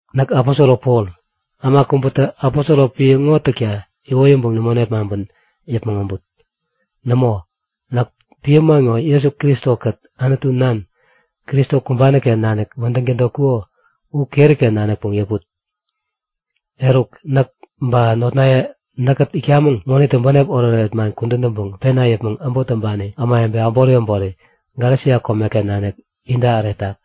Näk aposoro Pol, äma kubätä aposoro piä ŋo täkta iwoyäŋpäŋ nämo nepmaŋpän yäpmäŋ äbut. Nämo, näk piä man ŋo Jesu Kristo-kät Anutu Nan, Kristo kumbani-ken nanik wädäŋ tädotkuko u keri-ken nanikpäŋ yäput. Eruk näk ba notnaye näkkät itkamäŋ ŋonitä bänep oretoret man kudän täŋpäŋ pena yäpmäŋ äbot täŋpani ämawebe äbori äbori Galesia komeken nanik inta äretak.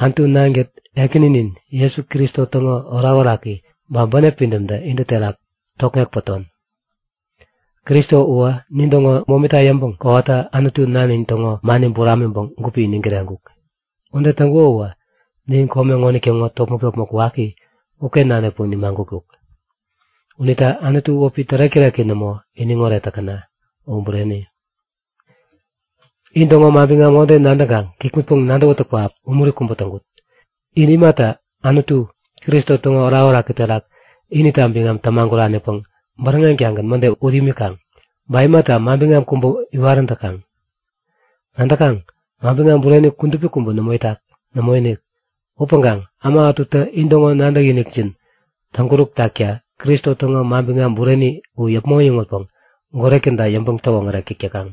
Anutu Nankät Ekäninin Jesu Kristo täŋo orakoraki ba bänep pidämtä intä terak tokŋek päton. Kristo uwä nintäŋo momita yäŋpäŋ kowata Anutu Nanin täŋo mani buramiŋpäŋ gupi iniŋ kireŋkuk. Ude täŋkuko uwä nin kome ŋonitäŋo topmäk-topmäk waki uken nanikpäŋ nimagutkuk. Unita Anutu wäpi tärek-täreki nämo, iniŋoret täkäna! U bureni. In täŋo manbiŋam ŋode nadäŋkaŋ kikŋutpäŋ-nadäwätäk pähap umuri kubä täŋkut! In imata Anutu, Kristo täŋo orakoraki terak inita biŋam tämaguranipäŋ bäräŋeŋ-tagän mäde ut imikaŋ? Ba imata manbiŋam kubä iwarän täkaŋ? Nadäkaŋ? Manbiŋam bureni kudupi kubä nämo itak. Nämoinik. Upäŋkaŋ äma ätutä intäŋo nadäkinikjin täŋkuräk takta Kristo täŋo manbiŋam bureni u yäpmäŋ äyäŋutpäŋ goret käda yäŋpäŋ-täwoŋärek täk täkaŋ.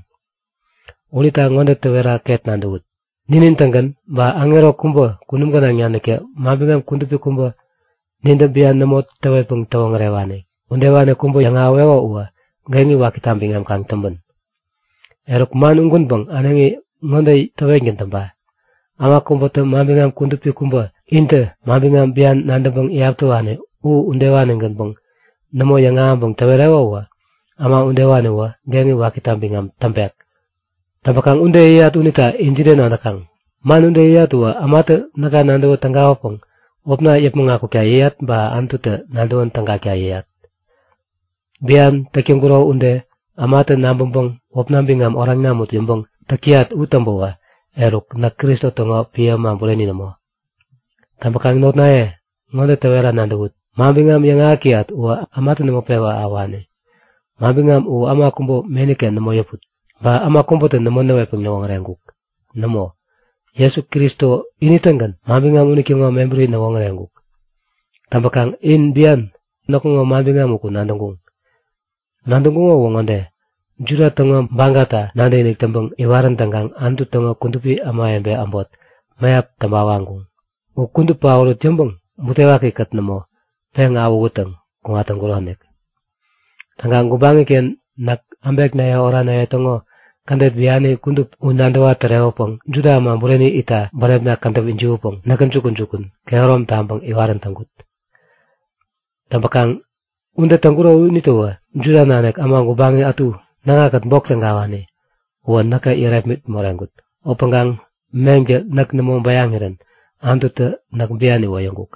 Unita ŋode täwera ket nadäwut; Ninin-tägän ba aŋero kubä kunum gänaŋ naniktä manbiŋam kudupi kubä, nintä bian nämo täwetpäŋ täwoŋärewani udewani kubä yäŋahäweko uwä geŋi wakita biŋam kaŋ täŋpän! Eruk, man ugänpäŋ äneŋi ŋode täwetgän täŋpa; Äma kubätä manbiŋam kudupi kubä intä manbiŋam bian nadäŋpäŋ iyap täwani u udewani-gänpäŋ nämo yäŋahäŋpäŋ täwereko uwä äma udewaniwä geŋi wakita biŋam täŋpek. Täŋpäkaŋ ude yäyat unita in jide nadäkaŋ? Man ude yäyat uwä ämatä näka nadäwä tägawäpäŋ wäpna yäpmäŋ akukta yäyat ba Anututä nadäwän tägakta yäyat? Bian täk täŋkuro ude ämatä nabäŋpäŋ wäpna biŋam oraŋ namut yäŋpäŋ täk täyat u täŋpäwä eruk näk Kristo täŋo piä äma bureni nämo! Täŋpäkaŋ notnaye ŋode täwera nadäwut; Manbiŋam yäŋahäk täyat uwä ämatä nämo pewä ahäwani. Manbiŋam u äma kubä meni-ken nämo yäput, ba äma kubätä nämo näwetpäŋ näwoŋäreŋkuk. Nämo, Jesu Kristo ini-tägän manbiŋam unitäŋo mebäri näwoŋäreŋkuk. Täŋpäkaŋ in bian näkŋo manbiŋam uku nadäŋkuŋ. Nadäŋkuŋo uwä ŋode; Juda täŋo bagata nadäkinik täŋpäŋ iwarän täŋkaŋ Anutu täŋo kudupi ämawebe äbot mäyap täŋpa waŋkuŋ. U kudup paorut yäŋpäŋ butewaki-kät nämo, peŋ awähuttäŋ kuŋat täŋkuronik. Täŋkaŋ gubaŋi-ken näk äbeknaye oranaye täŋo kädet biani kudup u nadäwa-tärewäpäŋ Juda äma bureni itta bänepna kädäp ijiwänpäŋ näkä jukun-jukun kehärom taŋpäŋ iwarän täŋkut. Täŋpäkaŋ ude täŋkuro unitäwä Juda nanik äma gubaŋi ätu näkŋakät bok tägawani uwä näkä yärepmit moreŋkut. Upäŋkaŋ meŋtä näk nämo bäyaŋirän Anututä näk bian iwoyäŋkuk.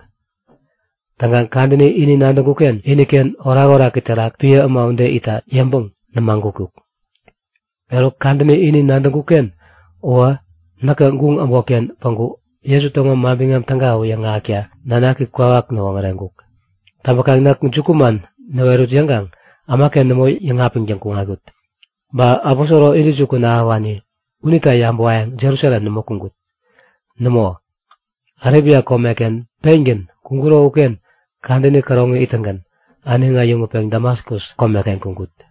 Täŋkaŋ kadäni ini nadäŋkuk-ken iniken orakoraki terak piä äma ude itta yäŋpäŋ nämagutkuk. Eruk kadäni ini nadäŋkuk-ken uwä näkä guŋ äbotken päŋku Jesu täŋo Manbiŋam Täga u yäŋahäkta Nanaki kwawak näwoŋäreŋkuk. Täŋpäkaŋ näk jukuman näwerut yäŋkaŋ ämaken nämo yäŋapiŋtäŋ kuŋatkut. Ba aposoro intäjukun ahäwani unita yabäwayäŋ Jerusalem nämo kuŋkut. Nämo, Arebia komeken pengän kuŋkuro uken kadäni käroŋi ittäŋgän äneŋi äyäŋutpeŋ Damaskus komeken kuŋkut.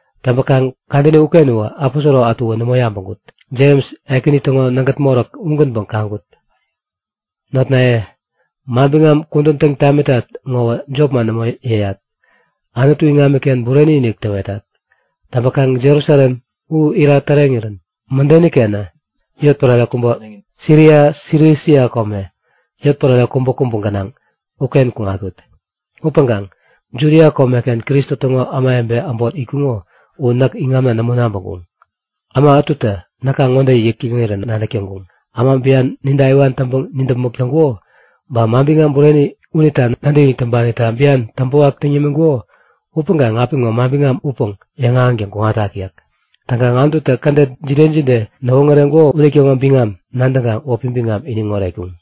Täŋpäkaŋ kadäni uken uwä aposoro ätuwä nämo yabäŋkut. Jems, Ekäni täŋo nägät moräk ugänpäŋ kaŋkut. Notnaye, manbiŋam kudän täŋ tamitat ŋowä jopman nämo yäyat. Anutu iŋamiken bureni-inik täwetat. Täŋpäkaŋ Jerusalem u ira täreŋirän mädenikenä Siria, Silisia kome, yotpärare kubäkubä gänaŋ uken kuŋatkut. Upäŋkaŋ Judia komeken Kristo täŋo ämawebe äbot itkuŋo u näk iŋamna nämo nabäŋkuŋ. Äma ätutä näka ŋode yäk täŋirä nadäk täŋkuŋ; Äma bian ninta iwan täŋpäŋ nidäpmäk täŋkuko, ba manbiŋam bureni unita nadäkinik täŋpanita bian täŋpäwak täŋ yämiŋkuko upäŋkaŋ apiŋo manbiŋam upäŋ yäŋahäŋtäŋ kuŋatak yäk. Täŋkaŋ Anututä kädet jide jide näwoŋäreŋkuko unitäŋo biŋam nadäŋkaŋ wäpi biŋam iniŋ oretkuŋ.